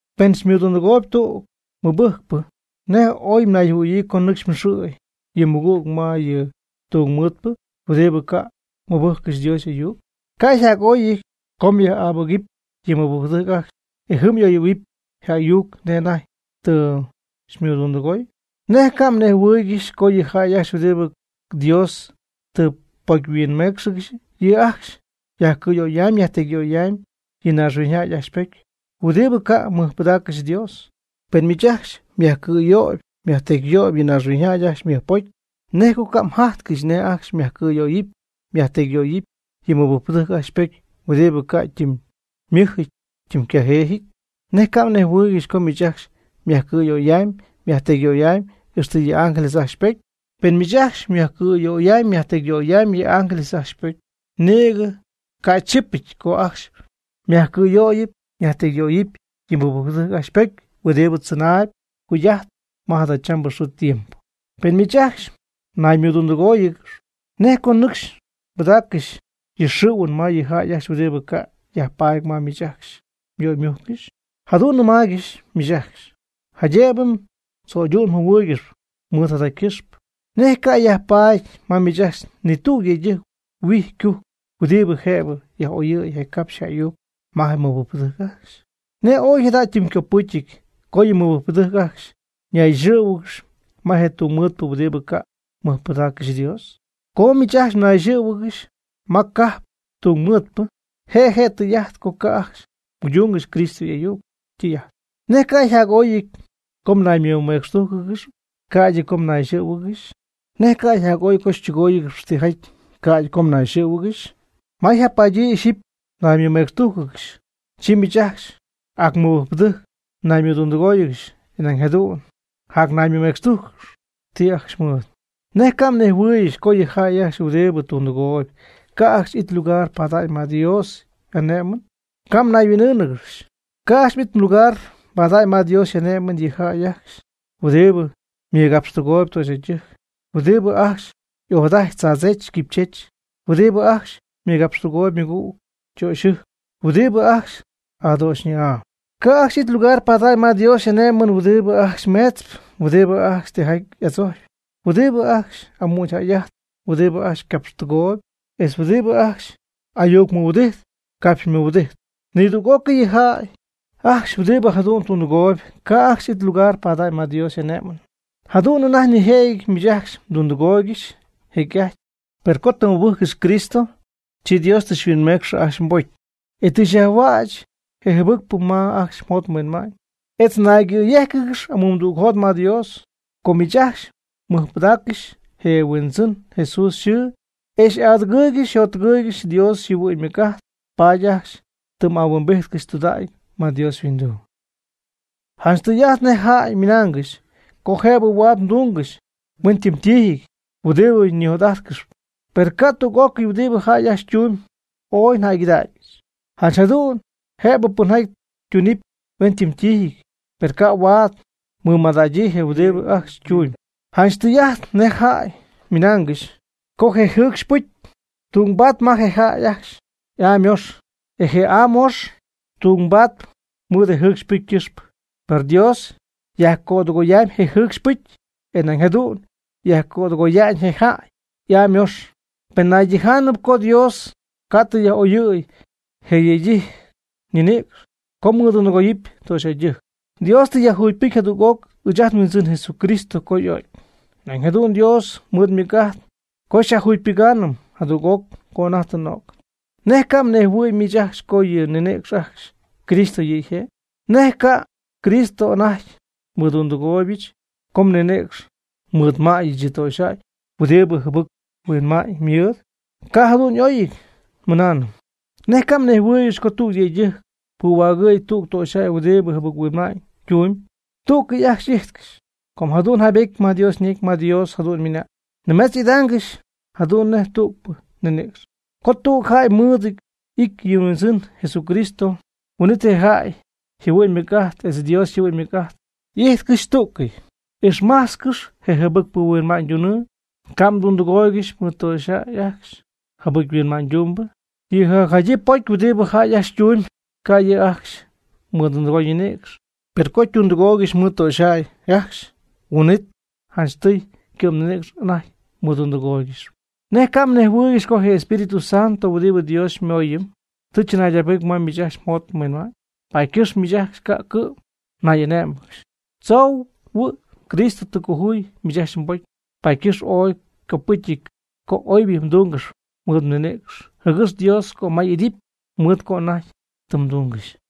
Pen xymɨdundɨgooyb tüg mɨbɨjcpɨ, ¿nej oy mnayjɨhuɨ̈yii co nɨcxy mxɨ̈y yɨ mmɨgüg ma yɨ tungmɨɨdpɨ huɨdibɨ ca' mɨbɨjccɨxy Dios y'ayuc? ¿Cay jac'oy co myaj'abɨgɨpy je mɨbɨjcpɨdɨjc ajcxy, e jɨm y'oyɨ̈huɨpy je ayuc nej anajty tɨ xymɨdundɨgoy? ¿Nej ca' mnejhuɨɨygɨxy co yɨ jäy ajcxy huɨdibɨ Dios tɨ ypocyhuinméecxɨgɨxy, yɨ' ajcxy yajcɨ̈yöyamyb yajtecyyöyamyb yɨ naaxhuiñyjäy ajcxy ypocy huɨdibɨ ca' mɨjpɨdaaccɨxy Dios? Pen miich ajcxy myajcɨ̈yöyɨp myajtecyyöyɨp yɨ naaxhuiñyjäy ajcxy ymɨjpocy, ¿nej co ca' mjajtcɨxy nej ajcxy myajcɨ̈yöyɨpy myajtecyyöyɨpy yɨ mɨbɨjcpɨdɨjc ajcxy ypocy huɨdibɨ ca' ytimymɨj ytimycajeejɨty? ¿Nej ca' mnejhuɨɨygɨxy co miich ajcxy myajcɨ̈yöyamyb myajtecyyöyamyb ixtɨ yɨ ángeles ajcxy ypocy? Pen miich ajcxy myajcɨ̈yöyamyb myajtecyyöyamyb yɨ ángeles ajcxy ypocy, nïgɨ ca' chipɨty co ajcxy myajcɨ̈yöyɨpy myajtecyyöyɨpy yɨ mɨbɨjcpɨdɨjc ajcxy ypocy huɨdibɨ tzɨnaayb jugy'ajtp ma jadachambɨ xɨɨ tiempo. Pen miich ajcxy mnaymɨdundɨgóoyɨgɨxp, ¿nej co nɨcxy mbɨdaaccɨxy yɨ mxɨ̈huɨn ma yɨ jäy ajcxy huɨdibɨ ca' yajpaady ma miich ajcxy myöymujccɨxy? Jadu'n nnɨmáaygɨxyɨch miich ajcxy, jaydëbɨ mdzöydu'njɨhuɨɨygɨxy mɨɨd jada ycɨxpɨ. ¿Nej ca' yajpaady ma miich ajcxy ni tüg yëydɨjc huijy ycujpɨ huɨdibɨ jëbɨ yaj'oyɨ̈y je capxy je ayuc ma je mɨbɨjcpɨdɨjc ajcxy? ¿Nej ooy jada ytimycopɨcyɨty co yɨ mɨbɨjcpɨdɨjc ajcxy ñayxɨ̈huɨgɨxɨpy ma je tungmɨɨdpɨ huɨdibɨ ca' mɨjpɨdaaccɨxy Dios? Co miich ajcxy mnayxɨ̈huɨgɨxy ma cajp tungmɨɨdpɨ, je' je tɨy'ajt co ca' ajcxy mguydúngɨxy Cristo y'ayuc ytɨy'ajt. ¿Nej cay jac'oy co mnaymɨmecxtújcɨgɨxɨpy, ca'ydɨ co mnayxɨ̈huɨgɨxy? ¿Nej cay jac'oy co xytɨgóoyɨgɨxɨpy tijaty, ca'ydɨ co mnayxɨ̈huɨgɨxy? Ma yjapadyii ixyipy mnaymɨmecxtújcɨgɨxy, chi miich ajcxy ac mɨbɨjcpɨdɨjc naymɨdundɨgóoyɨgɨxp, e nañ jadu'n mjanayméetzɨgɨxy ti ajcxy ymɨɨd. ¿Nej ca' mnejhuɨɨygɨxy co yɨ jäy ajcxy huɨdibɨ tundɨgooyb, ca' ajcxy it lugar pada'ñ ma Dios y'ane'my? Ca' mnayhuin'ɨɨngɨxy, ca' ajcxy it lugar pada'ñ ma Dios y'ane'my yɨ jäy ajcxy huɨdibɨ mɨgapxtɨgooyb töxyjäydɨjc, huɨdibɨ ajcxy ojadajtp tzaadzech quipychech, huɨdibɨ ajcxy mɨgapxtɨgooyb ymɨgüg ytöxyɨjc, huɨdibɨ ajcxy adöxyñɨ'aa. Ca' ajcxy it lugar pada'ñ ma Dios y'ane'my huɨdibɨ ajcxy meetzp, huɨdibɨ ajcxy tijaty adzojcp, huɨdibɨ ajcxy amügyjäy'ajtp, huɨdibɨ ajcxy capxtɨgooyb, etz huɨdibɨ ajcxy ayucmɨhuɨdijt capxmɨhuɨdijtp. Nidüg'ócɨy yɨ jäy ajcxy huɨdibɨ jadu'n tundɨgooyb, ca' ajcxy it lugar pada'ñ ma Dios y'ane'my. Jadu'n anajty nijëjɨty miich ajcxy mdundɨgooygɨxy jecy'ajty, per co tɨ mmɨbɨjccɨxy Cristo, chi Dios tɨ xyhuinmecxy ajcxy mbocy, e tɨ yajhuäch je jɨbɨcpɨ ma ajcxy mjot mhuinma'ñ, etz mnayyéjcɨgɨxy amumdügjot ma Dios. Co miich ajcxy mmɨjpɨdaaccɨxy je nHuindzɨn Jesús yxɨɨ e xy'adɨgɨɨygɨxy xyjottɨgɨɨygɨxy Dios yjɨhuɨ'ñ ymɨc'ajt, paady ajcxy tɨ m' ahuimbijtcɨxy tudägy ma Dios yhuinduu. Janch tɨy'ajt nej jäy ymɨnaangɨxy co jëbɨ huaad tungɨxy hueñytiijɨty huɨdibɨ ñijot'ajtcɨxyp. Per ca' tüg'ócɨy huɨdibɨ jäy ajcxy tuñ y'oyjäygɨdaacnɨty. Janch jadu'n jëbɨ pɨnjaty tunɨpy hueñytiijɨty, per ca' huaad ymɨmadägyii je huɨdibɨ ajcxy ytumyb. Janch tɨy'ajt nej jäy ymɨnaangɨxy co je jɨɨcxy pɨcy ytungbaady ma je jäy y'aa ymöx, e je aa möx ytungbaady mɨɨd je jɨɨcxy pɨcy ycɨxpɨ. Per Dios yajcödɨgoyamyb je jɨcxy pɨcy, e nañ jadu'n yajcödɨgoya'ñ je jäy y'aa ymöx. Per nañ tɨy'ajt co Dios ca' tɨ yaj'oyɨy je yëydɨjc ñinïcx, co mɨdundɨgooyɨpy töxyjäydɨjc. Dios tɨ yajjugypɨcy jadüg'oc ɨɨch ajt nHuindzɨn Jesucristo co y'o'cy. Nañ jadu'n Dios mɨɨd ymɨc'ajt co xyajjugypɨgaanɨm jadüg'oc co anajty tɨ n'o'cɨm. ¿Nej ca' mnejhuɨ̈y miich ajcxy co yɨ mninïcx ajcxy Cristo yɨ' yje'? ¿Nej cay Cristo anajty mɨdundɨgooybɨch co nnɨcxy mɨɨdmäyɨch yɨ töxyjäy huɨdibɨ jɨbɨc-huinma'ñ mɨɨd? ¡Ca' jadu'n y'óyɨty nimɨna! ¿Nej ca' mnejhuɨɨygɨxy co tüg yëydɨjc puhuägɨ̈y tüg töxyjäy huɨdibɨ jɨbɨc-huinma'ñ tumb, tügɨty ajcxy y'ijtcɨxy? Com jadu'n yjaybetyɨty ma Dios ñecy, ma Dios jadu'n ymɨna'ñ: “Nimetz y'idaangɨxy jadu'n nej tügpɨ ninïcx.” Co tüg jäy mɨɨd y'ity yɨ Huindzɨn Jesucristo, huin'it je jäy yjɨhuɨ'ñ ymɨc'ajt etz Dios yjɨhuɨ'ñ ymɨc'ajt y'ijtcɨxy tú'cɨy. Ixmajtzcɨx je jɨbɨc-huinma'ñydunɨɨ, ca' mdundɨgooygɨxy mɨɨd töxyjäy ajcxy jɨbɨc-huinma'ñydumbɨ. Yɨ jacjadyii pocy huɨdi jäy ajcxy ytumyb, ca' yɨ' ajcxy mɨdundɨgoy ninïcx. Per co ytundɨgooygɨxy mɨɨd töxyjäy ajcxy, huin'it janchtɨy ycɨ'mninïcx anajty ymɨdundɨgooygɨxyp. ¿Nej ca' mnejhuɨɨygɨxy co je Espíritu Santo huɨdibɨ Dios xymooyɨm, tɨ chɨnaydacpɨcy ma miich ajcxy mjot mhuinma'ñ? Paady ycɨxpɨ miich ajcxy ca' cɨ'm nay'ané'mɨgɨxy. Tzoohuɨ Cristo tɨ cojuy miich ajcxy mbocy, paady ycɨxpɨ ooy ycopɨcyɨty co oybɨ mdúngɨxɨp mɨɨd mninïcx, jɨgɨx Dios cömay y'idɨpy mɨɨd co oy anajty tɨ mdungɨxy.